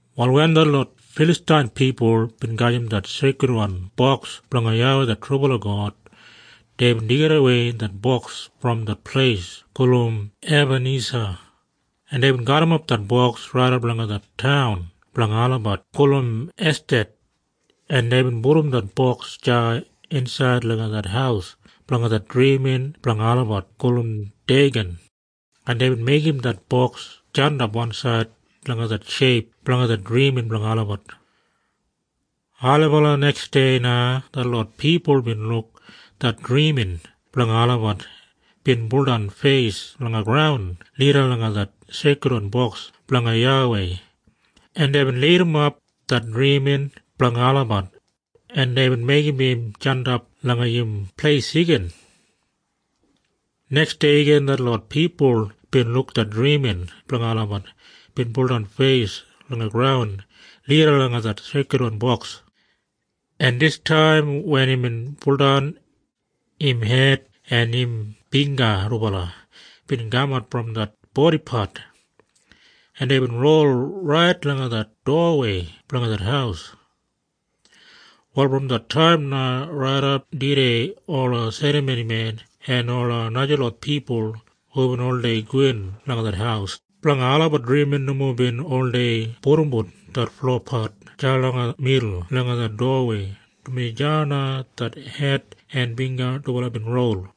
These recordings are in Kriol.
Wal wen detlot Filastain pipul bin gajim det Seikridwan Boks blanga YAWEI det trubala God, deibin deigidawei det boks brom det pleis gulum Ebanisa, en deibin garrimap det Boks raidap langa det taun blanga olabat gulum Eshdad, en deibin pudum det boks deya insaid langa det haus blanga det drimin blanga olabat gulum Deigan, en deibin meigim det boks jandap wansaid langa det sheip blanga det drimin blanga olabat. Ailibala neksdei na detlot pipul bin luk det drimin blanga olabat bin buldan feis langa graun lida langa det Seikridwan Boks blanga YAWEI, en deibin lidimap det drimin blanga olabat, en deibin meigim im jandap langa im pleis igin. Neksdei igin detlot pipul bin luk det drimin blanga olabat bin buldan feis langa graun lida langa det Seikridwan Boks, en distaim wen imbin buldan, im hed en im bingga dubala bin kamat brom det bodipat, en deibin rol rait langa det dowawei blanga det haus. Wal brom det taim na raidap tudei ola serramonimen en ola najalot pipul hubin oldei gowin langa det haus blanga olabat drimin nomo bin oldei pudumbut det flopat deya langa midul langa det dowawei, dumaji deya na det hed en bingga dubala bin rol.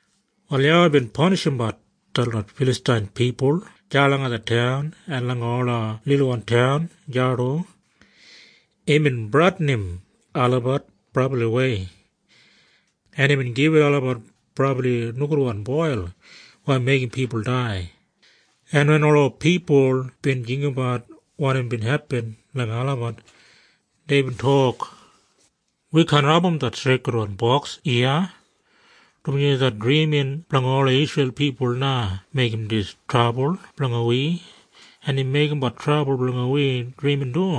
Wal YAWEI bin panishimbat detlot Filastain pipul deya langa det taun en langa ola lilwan taun deya du. Imbin bradinim olabat brabliwei, en imbin gibit olabat brabli nogudwan boil weya meigim pipul dai, en wen ola pipul bin jinggabat wanim bin hepin langa olabat, deibin tok, “Wi kaan abum det Seikridwan Boks iya, dumaji det drimin blanga ola Isreil pipul na meigim dis trabul blanga wi, en im meigimbat trabul blanga wi drimin du.”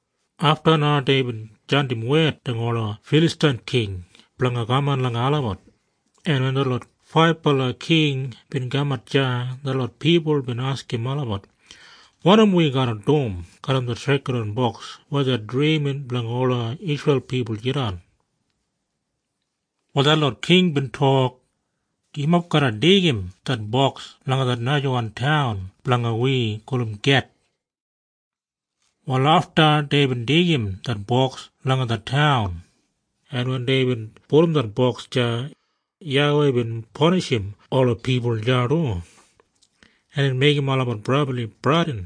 Afta na deibin jandim wed langa ola Filastain king blanga kaman langa olabat, en wen detlot faibala king bin kamat deya, detlot pipul bin askim olabat, “Wanim wi garra dum garram det Seikridwan Boks weya det drimin blanga ola Isreil pipul jidan?” Wal detlot king bin tok, “Yumob garra deigim det Boks langa det najawan taun blanga wi gulum Geth.” Wal afta deibin deigim det boks langa det taun, en wen deibin pudum det boks deya, YAWEI bin panishim ola pipul deya du, en imbin meigim olabat brabli bradin,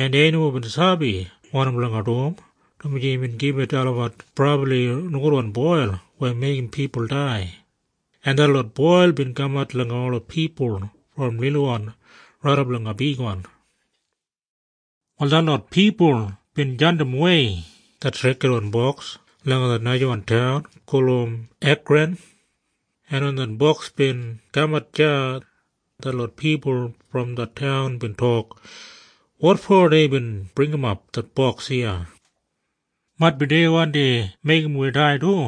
en dei nomo bin sabi wanim blanga dum, dumaji imbin gibit olabat brabli nogudwan boil weya meigim pipul dai, en detlot boil bin kamat langa ola pipul brom lilwan raidap langa bigwan. Wal detlot pipul bin jandimwei det Seikridwan Boks langa det najawan taun gulum Ekran, en wen det boks bin kamat deya, detlot pipul brom det taun bin tok, “Wotfo deibin bringimap det boks iya? Maitbi dei wandi meigim wi dai du!”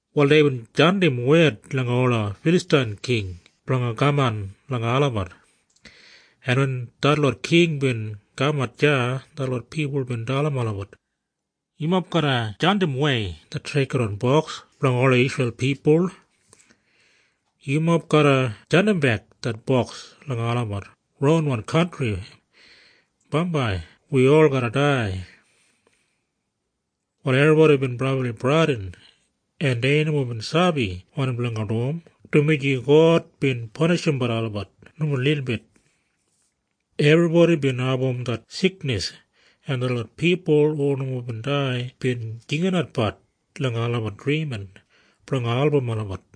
Wal deibin jandim wed langa ola Filastain king blanga kaman langa olabat, en wen detlot king bin kamat deya, detlot pipul bin dalim olabat, “Yumob garra jandimwei det Seikridwan Boks blanga ola Isreil pipul. Yumob garra jandimbek det boks langa olabat ronwan kantri. Bambai wi ol garra dai.” Wal ebribodi bin brabli bradin, en dei nomo bin sabi wanim blanga dum, dumaji God bin panishimbat olabat nomo lilbit. Ebribodi bin abum det siknis, en detlot pipul hu nomo bin dai bin jinginatbat langa olabat drimin blanga album olabat.